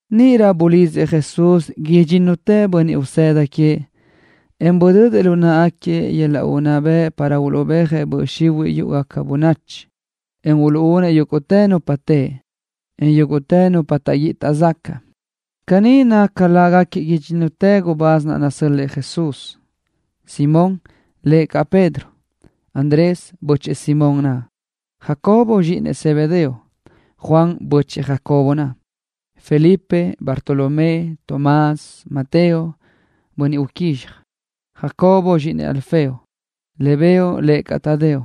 Níʼirö bulidzëʼ Jesús idxínnutëʼ bönniʼ usëda queëʼ, en budödëʼ lu náʼagaquiëʼ yöl-laʼ unná bëʼ para uluʼbéajëʼ böʼ xihuiʼ yúʼugaca bönachi, en uluʼúnëʼ yúguʼtë nupa teʼe, en yúguʼtë nupa bi taʼguíʼi taʼzacaʼ. Caní naca lágaquiëʼ idxínnutëʼ gubáz naʼ nasö́l-lëʼë Jesús: Simón, (lëʼ caʼ Pedro), Andrés, (bö́chëʼë Simón naʼ), Jacobo, (zxíʼinëʼ Zebedeo), Juan, (bö́chëʼë Jacobo naʼ), Felipe, Bartolomé, Tomás, Mateo, (bönniʼ uquízxaj), Jacobo, (zxíʼinëʼ Alfeo), Lebeo, (lëʼ caʼ Tadeo),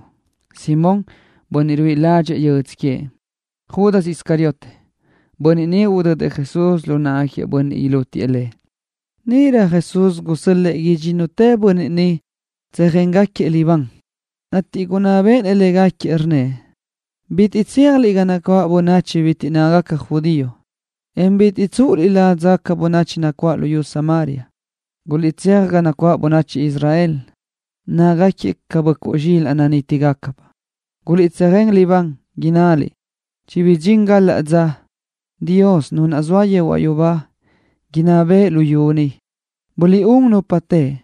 Simón, (bönniʼ ruíʼi ládxëʼë yödzö queëʼ), Judas Iscariote, (bönniʼ udödëʼ Jesús lu náʼagaquiëʼ bönniʼ ilútiëʼ Lëʼ). Níʼirö Jesús gusö́l-lëʼë idxínnutëʼ bönniʼ ni tsöjéngaquiëʼ libán, ateʼ gunná béʼenëʼ légaquiëʼ, rnnëʼ: —Bitiʼ tséajliʼ ga nacuáʼ bönachi bitiʼ nácagaca judío, en bitiʼ tsúʼuliʼ ládzagaca bönachi nacuáʼ luyú Samaria. Guliʼtséaj ga nacuáʼ bönachi Israel, nácagaquiëʼ ca böʼcuʼ zxílaʼdoʼ nanítigacabaʼ. Guliʼtsöjén libán, innaliʼ: “Chibidxín galaʼ dza Dios, Nu naʼ zoa yehuaʼ yubá, inná bëʼë luyú ni.” Buliʼún nupa teʼe.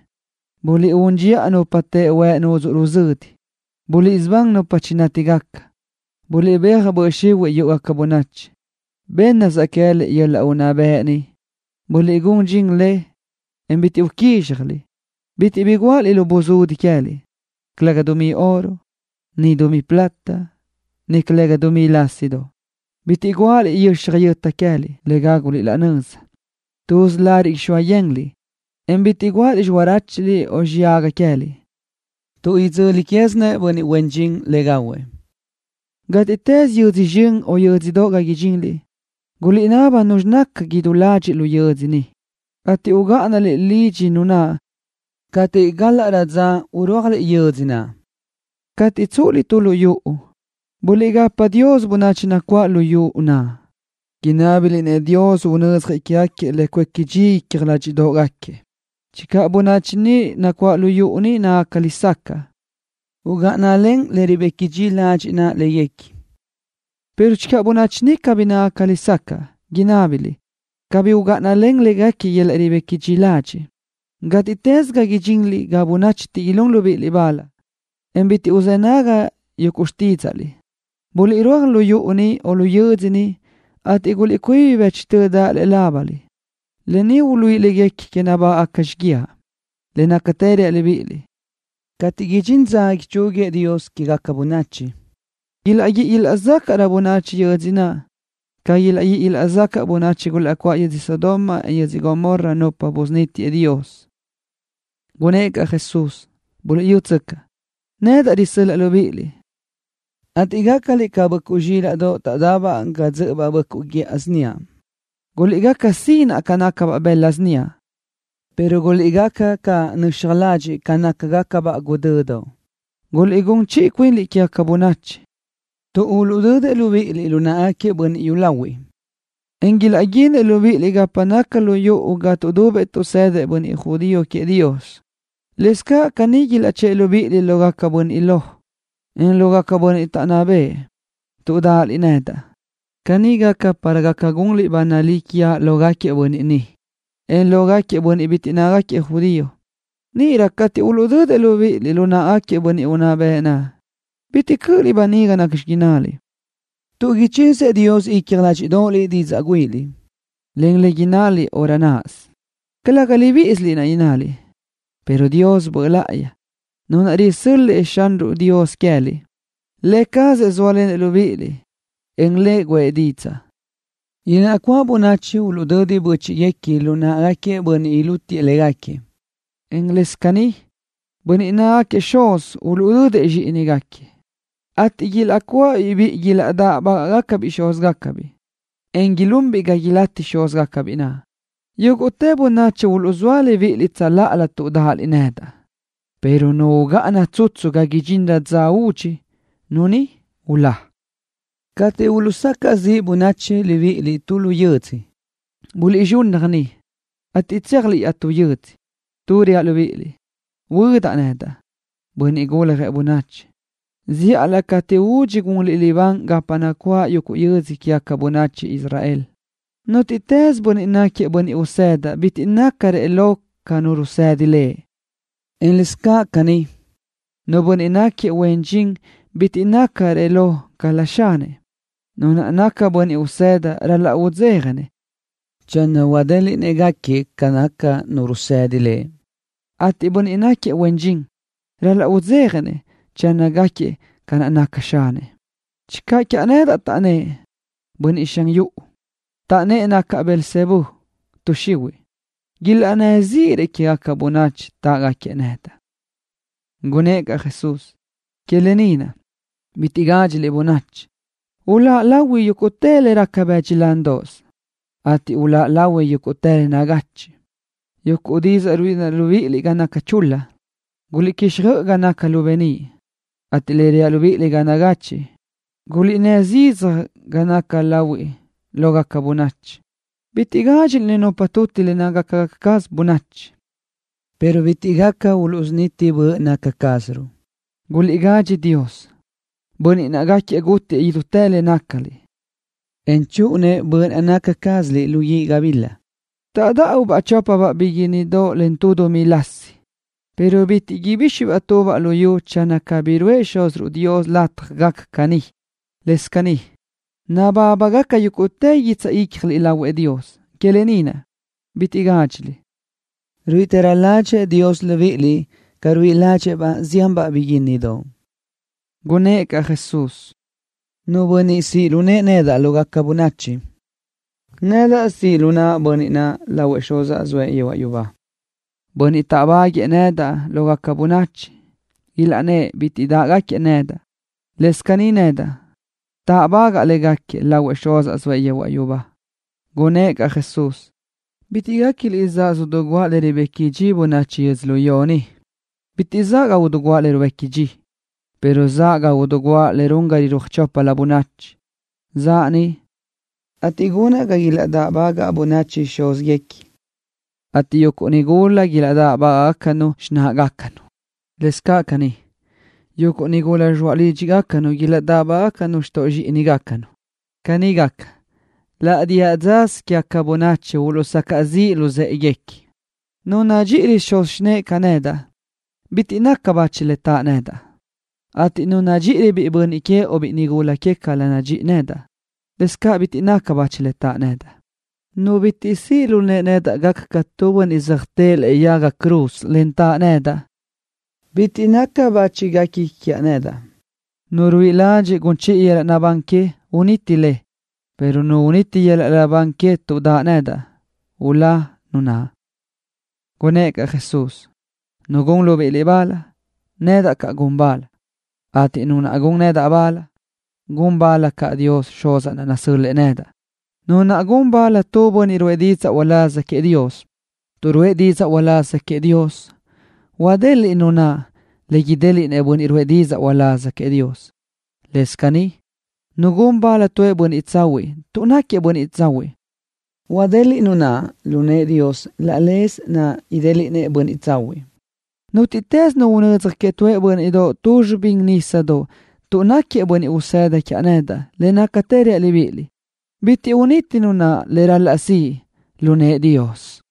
Buliʼún dxiʼa nupa teʼe huëʼ nudzuʼ ruzödi. Buliʼsubán nupa chinátigaca. Buliʼbéaj böʼ xihuiʼ yúʼugaca bönachi. Bénnasaʼ queë́liʼ yöl-laʼ unná bëʼ ni. Buliʼgún dxin le, en bitiʼ bi uquízxjaliʼ. ’Bitiʼ bi guáʼaliʼ lu buzudi queë́liʼ, calëga dumí oro, en calëga dumí plata, en calëga dumí lásidoʼ. Bitiʼ guáʼaliʼ yöxaj yöta queë́liʼ le gáguliʼ laʼ nöza. Tuz lariʼ ixóa yenliʼ, en bitiʼ guáʼaliʼ xiráchuliʼ o xiyaga queë́liʼ, tuʼ idzöli quézinëʼ bönniʼ huen dxin le gahuëʼ. ’Gátiʼtës yödzö zxön o yö́dzödoʼ ga idxinliʼ, guliʼnaba nuzxi naca idú ladxiʼ lu yödzö niʼ, ateʼ ugáʼanaliʼ lidxi nu naʼ cateʼ gálaʼrö dza urúajliʼ yödzö naʼ. Cateʼ tsúʼuliʼ tu lu yuʼu, buliʼgapa Dios bönachi nacuáʼ lu yuʼu naʼ, inábiliʼ-nëʼ Dios unödzjëʼ quégaquiëʼ le cuéqui dxi icja ládxiʼdoʼgaquiëʼ. Channö bönachi nacuáʼ lu yuʼu niʼ nácagaca lesacaʼ, ugáʼanalen le ribequi dxi ladxiʼ naʼ léguequi, pero channö bönachi naʼ cabí nácagaca lesacaʼ, inábaliʼ cabí ugáʼana lë naʼ ribequi dxi ladxiʼ len léguequi. Gátiʼtës ga idxinliʼ ga bönachi niʼ bitiʼ ilún libíʼiliʼ bal, en bitiʼ uluʼzë́ nagui xtídzaʼliʼ, buliʼrúaj lu yuʼu niʼ o yödzö niʼ, ateʼ guliʼcuíbi bëchtö daʼ lëʼe lábaliʼ, le uluíʼi léguequi nabágaʼgaca xíguiaʼ. Le nácatë reaʼ libíʼiliʼ, cateʼ idxín dza ichúguiëʼ Dios quégaca bönachi, ilaʼguíʼi ilaʼzácaʼrö bönachi yödzö naʼ ca ilaʼguíʼi ilaʼzacaʼ bönachi gulaʼcuáʼ yödzö Sodoma, en yödzö Gomorra, nupa niʼ busunítiëʼ Dios. Gunnë́ʼ caʼ Jesús: —Buliʼyútsöcaʼ, nedaʼ risö́l-laʼa libíʼiliʼ, ateʼ gácaliʼ ca böʼcuʼ zxílaʼdoʼ taʼdabaʼ ga dzö́ʼöbaʼ böʼcuʼ guíʼa síniaʼ. Guliʼgaca sinaʼ ca nácagacabaʼ sinaʼ bëla síniaʼ, pero guliʼgaca caʼ nöxaj ladxiʼ ca nácagacabaʼ guʼdödoʼ. Guliʼgún chiʼi cuinliʼ quégaca bönachi, tuʼ uluʼdödëʼ libíʼiliʼ lu náʼagaquiëʼ bönniʼ yúlahuiʼ, en ilaʼguínëʼ libíʼiliʼ gapa naca lu yuʼu ga tuʼdubëʼ tuʼsëdëʼ bönniʼ judío queëʼ Dios. Lëscaʼ caní, ilaʼchë́ʼë libíʼiliʼ lógaquiëʼ bönniʼ lo, en lógaquiëʼ bönniʼ taʼnná bëʼë, tuʼ dáʼaliʼ nedaʼ. Caní gaca para gaca gunliʼ ba nalí quiaʼ lógaquiëʼ bönniʼ niʼ, en lógaquiëʼ bönniʼ bitiʼ nácagaquiëʼ judío. Níʼirö cateʼ uluʼdödëʼ libíʼiliʼ lu náʼagaquiëʼ bönniʼ unná bëʼ naʼ, bitiʼ cö́ʼöliʼ böniga nacxi innaliʼ, tuʼ ichizëʼ Dios icja ládxiʼdoʼoliʼ didzaʼ güíʼiliʼ, en ca innaliʼ laʼ dza náʼasö. Calëga libíʼisiliʼ naʼ innaliʼ, pero Dios Böʼ Láʼayi, Nu naʼ risö́l-lëʼë Xúziruʼ Dios queë́liʼ, Lë cazëʼ sóalenëʼ libíʼiliʼ, en guʼë didzaʼ. ’Ilaʼcuáʼ bönachi uluʼdödi bö́chiʼguequi lu náʼagaquiëʼ bönniʼ ilútiëʼ légaquiëʼ, en lëscaʼ caní, bönniʼ nácagaquiëʼ xuz uluʼdödëʼ zxíʼinigaquiëʼ, ateʼ ilaʼcuáʼabiʼ biʼi ilaʼdáʼbagaʼbiʼ xúzgacabiʼ, en ilunbiʼ ga ilátiëʼ xúzgacabiʼ naʼ. Yúguʼtë bönachi uluʼzóa libíʼiliʼ tsöláʼalö tuʼ dáʼaliʼ nedaʼ, pero nu ugáʼana tsutsu ga idxinrö dza údxi, nu ni ulá. Cateʼ uluʼsacaʼ ziʼ bönachi libíʼiliʼ tu lu yödzö, buliʼzxunnaj niʼ, ateʼ tséajliʼ iaʼtú yödzö, tuʼ reaʼ libíʼiliʼ, huödaʼ nedaʼ, Bönniʼ Guljëʼ Bönachi, zíʼalö cateʼ údxi gunliʼ libán gapa nacuáʼ yuguʼ yödzö quégaca bönachi Israel. ’Nútiʼtës bönniʼ náquiëʼ bönniʼ usëda bitiʼ nácarëʼ lo ca nu rusëdi lëʼ, en lëscaʼ caní, nu bönniʼ náquiëʼ huen dxin bitiʼ nácarëʼ lo ca xanëʼ. Nu naʼ naca bönniʼ usëda ral-laʼ udzéjanëʼ channö huadéliʼnëʼ gáquiëʼ ca naca nu rusëdi lëʼ, ateʼ bönniʼ huen dxin naʼ ral-laʼ udzéjanëʼ channö gáquiëʼ ca naca xanëʼ. Channö taʼnnë́ʼ quiaʼ nedaʼ, bönniʼ xan yuʼu, taʼnnë́ʼ nacaʼ Belzebú tuʼ xihuiʼ, ilaʼnnë́ zíʼirëʼ quégaca bönachi táʼgaquiëʼ nedaʼ. Gunnë́ʼ caʼ Jesús: —Que lë ni naʼ, bitiʼ gádxiliʼ bönachi. Hualáʼ lahui yúguʼtë le raca bëdxi lándoʼos, ateʼ huáca bëʼ yúguʼtë le nagachiʼ. Yuguʼ didzaʼ ruíʼilenaʼ libíʼiliʼ ga naca chul-la, guliʼquixjöʼ ga naca lu beníʼ, ateʼ le reaʼ libíʼiliʼ ga nagachiʼ, guliʼnnë́ zidzaj ga naca lahuiʼ lógaca bönachi. Bitiʼ gádxiliʼ nupa tuti le nácagaca caz bönachi, pero bitiʼ gaca uluʼsuniti böʼ naca cázaruʼ. Guliʼgadxi Dios, Bönniʼ naʼ gaca gútiëʼ idútë le nácaliʼ, en chúʼunëʼ böʼ naca cázaliʼ lu guíʼ gabila. ’Taʼdáʼubaʼ chópabaʼ biguínnidoʼ len tu dumí lásidoʼ, pero bitiʼ ibíxibaʼ tubaʼ lu yu channö cabí ruʼë Xúziruʼ Dios lataj gaca caní. Lëscaʼ caní, nabábagaca yúguʼtë guitsaʼ ícjaliʼ lahuëʼ Dios. Que lë ni naʼ, bitiʼ gádxiliʼ. Ruíʼitërö ládxëʼë Dios libíʼiliʼ ca ruíʼi ládxëʼë-baʼ zianbaʼ biguínnidoʼ. Gunnë́ʼ caʼ Jesús: —Nu bönniʼ siʼ lu nëʼë nedaʼ lógaca bönachi, nedaʼ siʼ lu naʼa bönniʼ naʼ lahuëʼ Xuzaʼ zoëʼ yehuaʼ yubá. Bönniʼ taʼdáʼbaguëʼë lógaca bönachi, ilaʼnnë́ʼ bitiʼ taʼdë́ʼë nedaʼ, lëscaʼ caní nedaʼ táʼbagaʼa légaquiëʼ lahuëʼ Xuzaʼ zoëʼ yehuaʼ yubá. Gunnë́ʼ caʼ Jesús: —Bitiʼ guéquiliʼ zaʼa idiguʼa le ribequi dxi bönachi yödzölió ni. Bitiʼ zaʼa idiguʼa le ribequi dxi, pero zaʼa idiguʼa le gun ga ilaʼrúaj choplö bönachi. Zaʼa ni, ateʼ gunaʼ ga ilaʼdáʼbagaʼ bönachi xúzguequi, ateʼ yuguʼ nigula ilaʼdáʼbagaʼnu caʼ xináʼagacanu. Lëscaʼ caní, yuguʼ nigula zxoaʼ lídxigacanu ilaʼdáʼbagaʼnu xtoʼ zxíʼininu. Caní gaca, laʼ diʼa dzasö quégaca bönachi uluʼsacaʼ ziʼ luzë́ʼeguequi. ’Nu nadxíʼirö xuz xinëʼe ca nadxíʼi nedaʼ, bitiʼ naca bachi nu naʼ taʼ nedaʼ, ateʼ nu nadxíʼirö biʼi bönniʼ que o biʼi nigula que ca nadxíʼi nedaʼ, bitiʼ naca bachi nu naʼ taʼ nedaʼ. Nu bitiʼ siʼ lu nëʼe gaca ca tu bönniʼ söjtë́ʼë lëʼe yaga cruz, en taʼ nedaʼ, bitiʼ naca bachi guequi quiaʼ nedaʼ. Nu ruíʼi ladxiʼ gun chiʼi yöl-laʼ naʼbán que, uniti le, pero nu uniti yöl-laʼ naʼbán que tuʼ daʼ nedaʼ, ulá nu naʼ. Gunnë́ʼ caʼ Jesús: —Nu gun libíʼiliʼ bal, nedaʼ caʼ gun bal, ateʼ nu naʼ gun nedaʼ bal, gun bal caʼ Dios Xuz nasö́l-lëʼë nedaʼ. Nu gun bal tu bönniʼ ruʼë didzaʼ uláz queëʼ Dios tuʼ ruʼë didzaʼ uláz queëʼ Dios, huadeliʼ nu naʼ lu nëʼë Dios laʼ leze naʼ idéliʼnëʼ bönniʼ ruʼë didzaʼ uláz queëʼ Dios. Lëscaʼ caní, nu gun bal tu bönniʼ tsahuiʼ tuʼ náquiëʼ bönniʼ tsahuiʼ, huadeliʼ nu naʼ lu nëʼë Dios laʼ leze naʼ idéliʼnëʼ bönniʼ tsahuiʼ. Nútiʼtës nu unödzaj queëʼ tu bö́nniʼdoʼ ni tu zxibíndoʼos nisa tuʼ náquiëʼ bönniʼ usëda quiaʼ nedaʼ, le nácatë reaʼ libíʼiliʼ, bitiʼ uniti nu naʼ le ral-laʼ siʼ lu nëʼë Dios.